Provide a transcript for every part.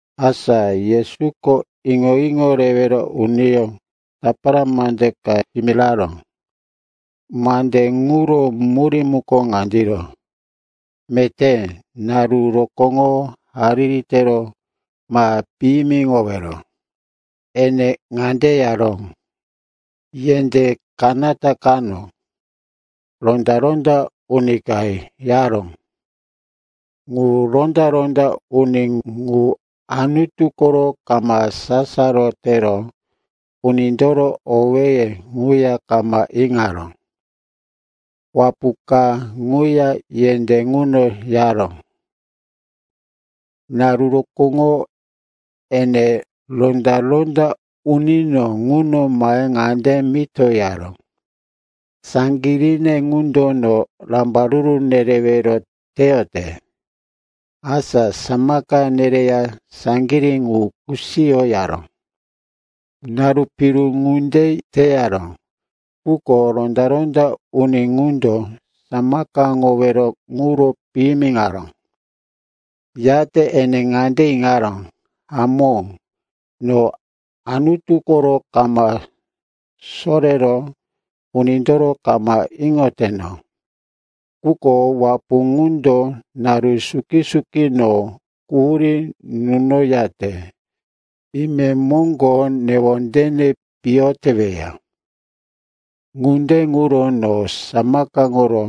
Asa Yesuko iŋo-iŋo rewero uniyó tapara mande ka yimiraró. Mande ŋuro murí muko ŋandiro: meté naru rokóŋo hariri tero ma piyimiŋowero. Ene ŋande yaró, “Yendé kanata kano ronda-ronda uni ka yaró. Ŋu ronda-ronda uni ŋu Anutu koro kama sasaro tero unindoro owéye ŋuya kama iŋaró. Wapu ka ŋuya yendé ŋuno yaró. Naru rokóŋo ene ronda-ronda unino ŋuno mahe ŋande mito yaró, ‘Saŋgiríne ŋundo no rambaruru nerewero teyote. Asa samaka nereya saŋgirí ŋu kusiyo,’ yaró. Naru piru ŋunde teyaró, quko ronda-ronda uni ŋundo samakaŋowero ŋuro piyimiŋaró. “Yate ene ŋande iŋaró, ‘Hamó, no Anutu koro kama sorero unindoro kama iŋoteno. Quko wapu ŋundo naru suki-suki no quhurí nunoyate imemoŋgo newondene piyo teweya. Ŋunde ŋuro no samakaŋoro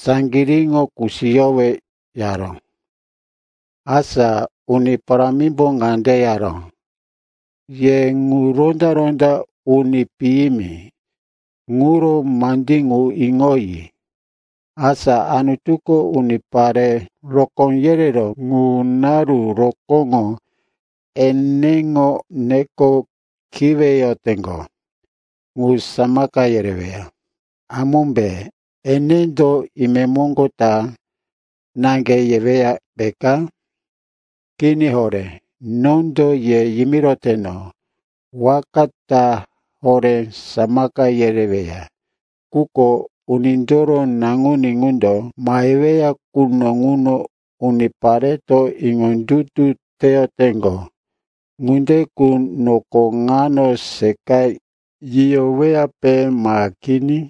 saŋgiríŋo kusiyowe,’ yaró.” Asa Uni Parámimbo ŋande yaró, “Ye ŋu ronda-ronda uni piyimi ŋuro mandí ŋu iŋoyi. Asa Anutuko unipare rokó yereró ŋu naru rokóŋo eneŋo neko kiweyoteŋgo ŋu samaka yereweya, hamómbe? Enendo, ‘Imemoŋgo ta,’ naŋge yeweya, peka? Kini horé. Nondo ye yimiroteno, waka ta horé samaka yereweya. Quko Unindoro Naŋuní ŋundo maheweya quno ŋuno, unipareto iŋondutu teyoteŋgo ŋunde qu noko ŋano seqa yiyoweyape ma kini?”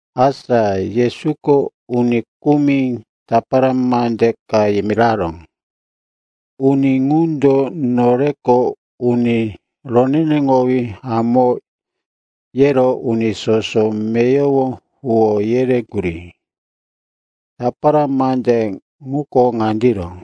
Asa Yesuko uni kumi tapara mande ka yimiraró. Uni ŋundo, “Noreko uni roneneŋowí hamó,” yero uni soso meyowo huwó yereŋgurí. Tapara mande ŋuko ŋandiro.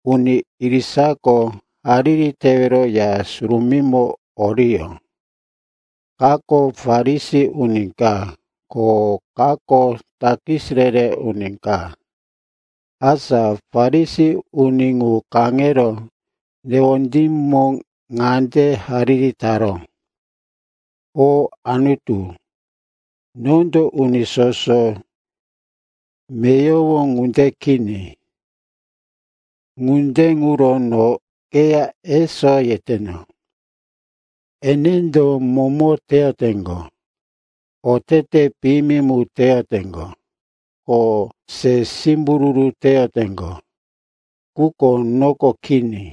“Uni irisako hariri tewero Ya Surumímo oriyó. Kako Farisi uni ka, ko kako takis re-re uni ka. Asa Farisi uni ŋu kaŋero newondímo ŋande hariri taró, ‘O Anutu, nondo uni soso meyowo ŋunde kini, ŋunde ŋuro no keya eso yeteno. Enendo momo teyoteŋgo, otete piyimi mu teyoteŋgo, ko se simbururu teyoteŋgo. Quko noko kini.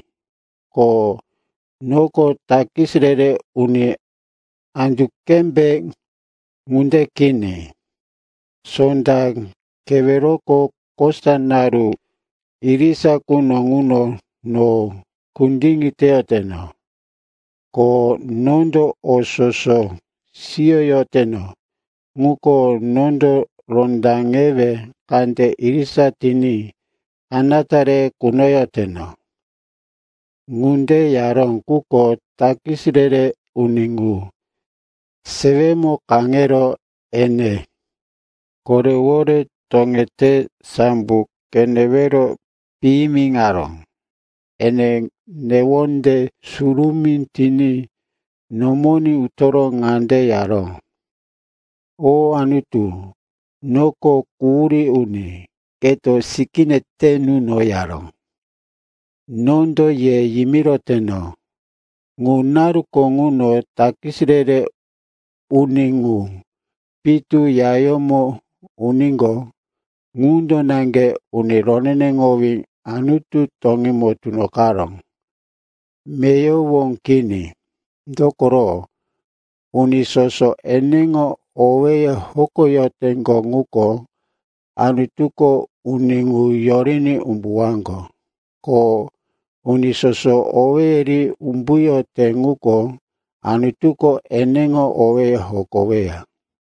Ko noko takis re-re uni andu qembe ŋunde kini. Sonda keweroko kosa naru irisa quno ŋuno no kundiŋi teyoteno. Ko nondo o soso siyoyoteno, ŋuko nondo rondaŋewe kande irisa tiní kanata re kunoyoteno.’ “Ŋunde yaró, quko takis re-re uni ŋu sewemo kaŋero, ene korewore toŋete sambo qenewero piyimiŋaró. Ene newonde surumí tiní nomoní utoro ŋande yaró, ‘O Anutu, noko quhurí uni. Keto sikíne te nuno,’ yaró.” “Nondo ye yimiroteno, ŋu naruko ŋuno takis re-re uni ŋu pitu yayómo uníqo, ŋundo naŋge uni roneneŋowí Anutu toŋímo tunoqaró, meyowo kini. Dokoro, uni soso eneŋo owéye hokoyoteŋgo ŋuko, Anutuko uni ŋu yoriní umbuwaŋgo. Ko uni soso owéye ri umbuyote ŋuko, Anutuko eneŋo owéye hokoweya.”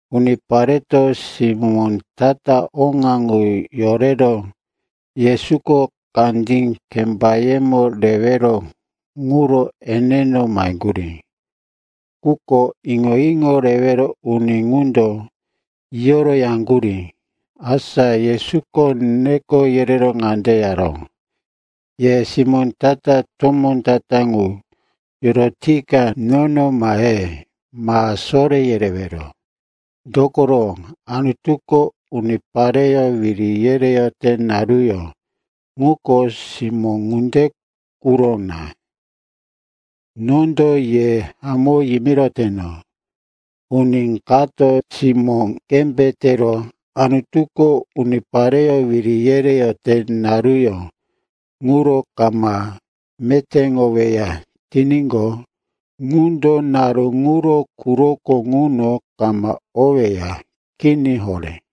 Unipareto simó ta-ta oŋa qu yorero Yesuko kandí kembayemo rewero quro eneno maheŋgurí. Quko iŋo-iŋo rewero uni ŋundo yiyo yaŋgurí. Asa Yesuko neko yerero ŋande yaró, “Ye simó ta-ta tomó ta-ta ŋu yorotika nono mahe, ma soré yerewero. Dokoro Anutuko unipareyó wiri yereyote naruyó ŋuko simó ŋunde quro na. Nondo ye hamó yimiroteno, uni kato simó qembe tero Anutuko unipareyó wiri yereyote naruyó ŋuro kama metéŋoweya tiníqo, ŋundo naru ŋuro quroko ŋuno kama oweya. Kini horé.”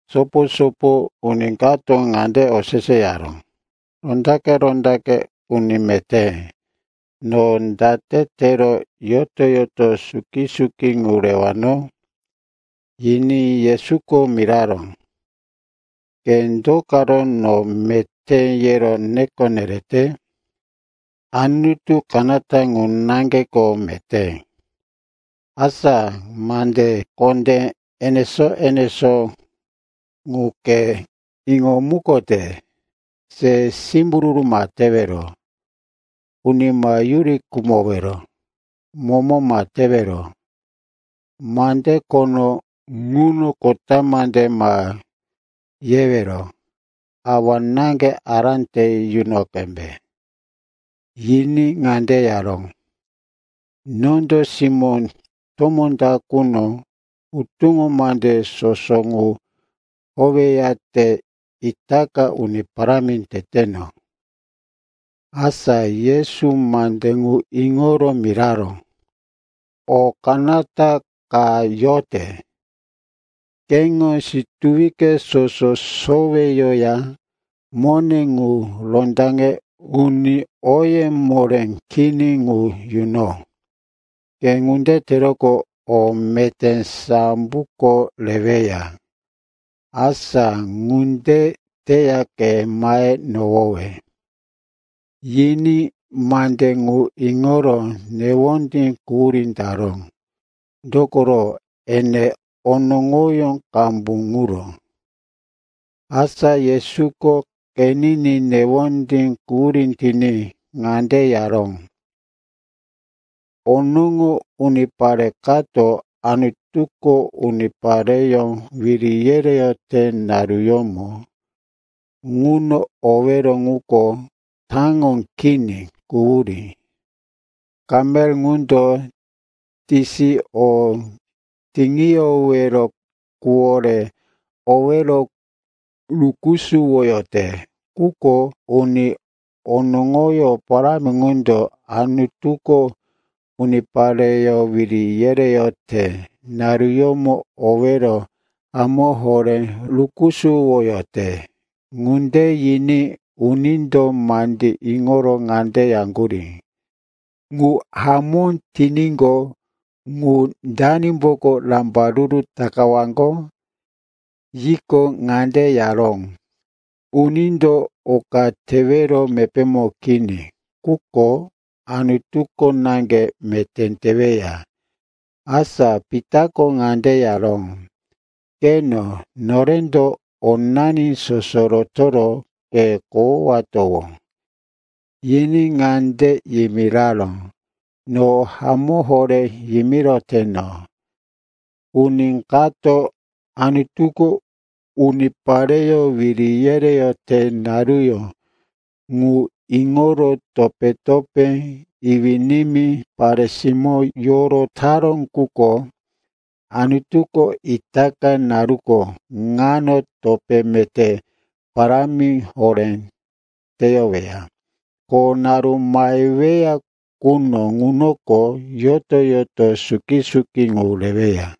Sopo-sopo uni kato ŋande oseseyaró, “Rondaqe-rondaqe uni meté, no date tero yoto-yoto suki-suki ŋu rewano?” Yiní Yesuko miraró, “Ke do karo no, meté, yero neko nerete? Anutu kanata ŋu naŋgeko meté. Asa mande kondé enesó-enesó ŋu ke iŋomukote: se simbururu ma tewero, uni ma yuri khumowero, momo ma tewero, mande khono ŋuno kota mande ma yewero, awa-náŋge ará te yuno qembe.” Yiní ŋande yaró, “Nondo simó tomó ta quno hutuŋo mande soso ŋu howeyate itaka uni parámi teteno.” Asa Yesu mande ŋu iŋoro miraró, “O kanata ka yote. Keŋo situwi soso soweyoya mone ŋu rondaŋe uni oye moré kini ŋu yuno. Ke ŋunde teroqo, o meté samboko reweya. Asa ŋunde teya ke mahe nohowe.” Yiní mande ŋu iŋoro newondí quhurí taró, dokoro ene onoŋoyó qambu ŋuro. Asa Yesuko qeniní newondí quhurí tiní ŋande yaró, “Onoŋo unipare kato Anutuko unipareyó wiri yereyote naruyómo ŋuno owero ŋuko taŋo kini, quhurí. Kamel ŋundo tisi o tiŋiyowero quwore owero rukusuwoyote. Quko uni onoŋoyó parámi ŋundo Anutuko unipareyó wiri yereyote naruyómo owero hamó horé rukusuwoyote.” Ŋunde yiní unindo mandí iŋoro ŋande yaŋgurí, “Ŋu hamó tiníqo, ŋu danimboko rambaruru takawaŋgo?” Yiqo, ŋande yaró, “Unindo oka tewero mepémo kini, ŋuko Anutuko naŋge meté teweya.” Asa Pitako ŋande yaró, “Qeno, norendo onani soso rotoro ke kohowatowó.” Yiní ŋande yimiraró, “No hamó horé yimiroteno. Uni kato Anutuko unipareyó wiri yereyote naruyó ŋu iŋoro topé-topé, iwí-nimí, pare-simó yorotaró quko Anutuko itaka naruko ŋano topé meté parámi horé teyoweya. Ko naru maheweya quno ŋunoko, yoto-yoto suki-suki qu reweya.”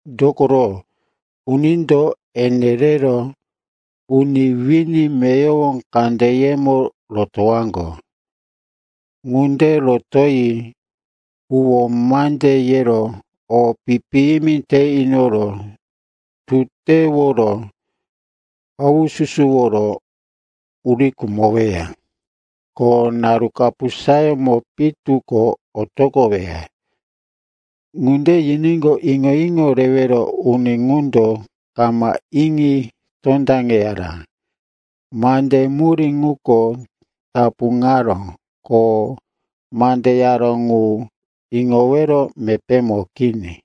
Dokoro unindo ene rero uni wini meyowo kandeyemo rotowaŋgo. Ŋunde rotoyi huwó mande yero o pi-piyimi te inoro tuteworo haususuworo uri khumoweya. Ko naru kapusayómo pitu ko otoqoweya.” Ŋunde yiníqo, iŋo-iŋo rewero uni ŋundo kama iŋi tondaŋeyara. Mande murí ŋuko tapuŋaró, ko mande yaró ŋu iŋowero mepémo kini.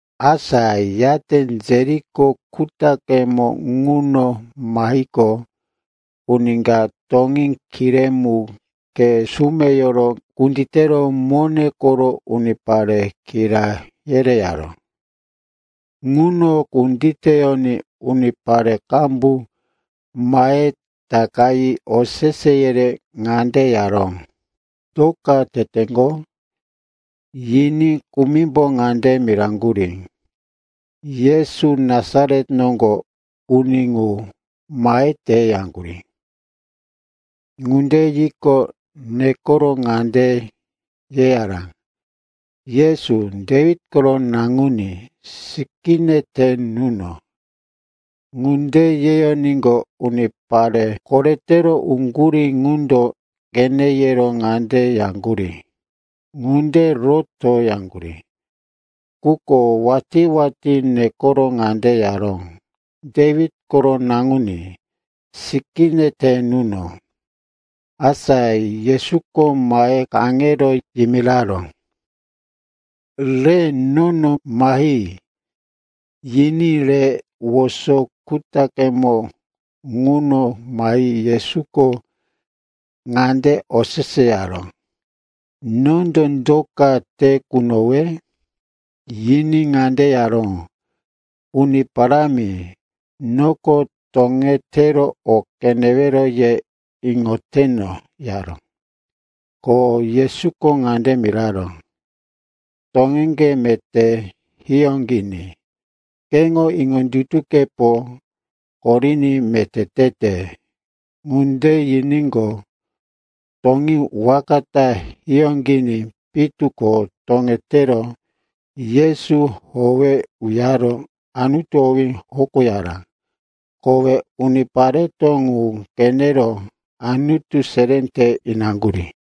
Asa yate Jeriko kutaqemo ŋuno mahiqo, uni ka toŋí kiré mu khe sumeyoro kunditero mone koro unipare kira yereyaró. Ŋuno kunditeyoní unipare qambu mahe takayi osese yerero ŋande yaró, “Do ka teteŋgo?” Yiní kumimbo ŋande miraŋgurí, “Yesu, Nasaret noŋgo uni ŋu, mahete,” yaŋgurí. Ŋunde yiqo, nekoro ŋande yeyaró, “Yesu, Dewit koro naŋuní, sikíne te nuno!” Ŋunde yeyoníqo, unipare koretero oŋgurí ŋundo qene yero ŋande yaŋgurí, “Ŋunde roto!” yaŋgurí. Quko watí-watí nekoro ŋande yaró, “Dewit koro naŋuní, sikíne te nuno!” Asa Yesuko mahe kaŋero yimiraró, “Re nono mahi,” yiní re woso kutaqemo ŋuno mahi Yesuko ŋande oseseyaró, “Nondo do ka te kunowe?” Yiní ŋande yaró, “Uni Parámi, noko toŋetero o qenewero ye iŋoteno,” yaró. Ko Yesuko ŋande miraró, “Toŋeŋge meté hiyóqiní. Keŋo iŋondutukepo koriní meté tete.” Ŋunde yiníqo, toŋí waka ta hiyóqiní pitu ko toŋetero Yesu howe uyaro Anutu owí hokoyaró. Kowe unipareto ŋu qenero Anutu seré te inaŋgurí.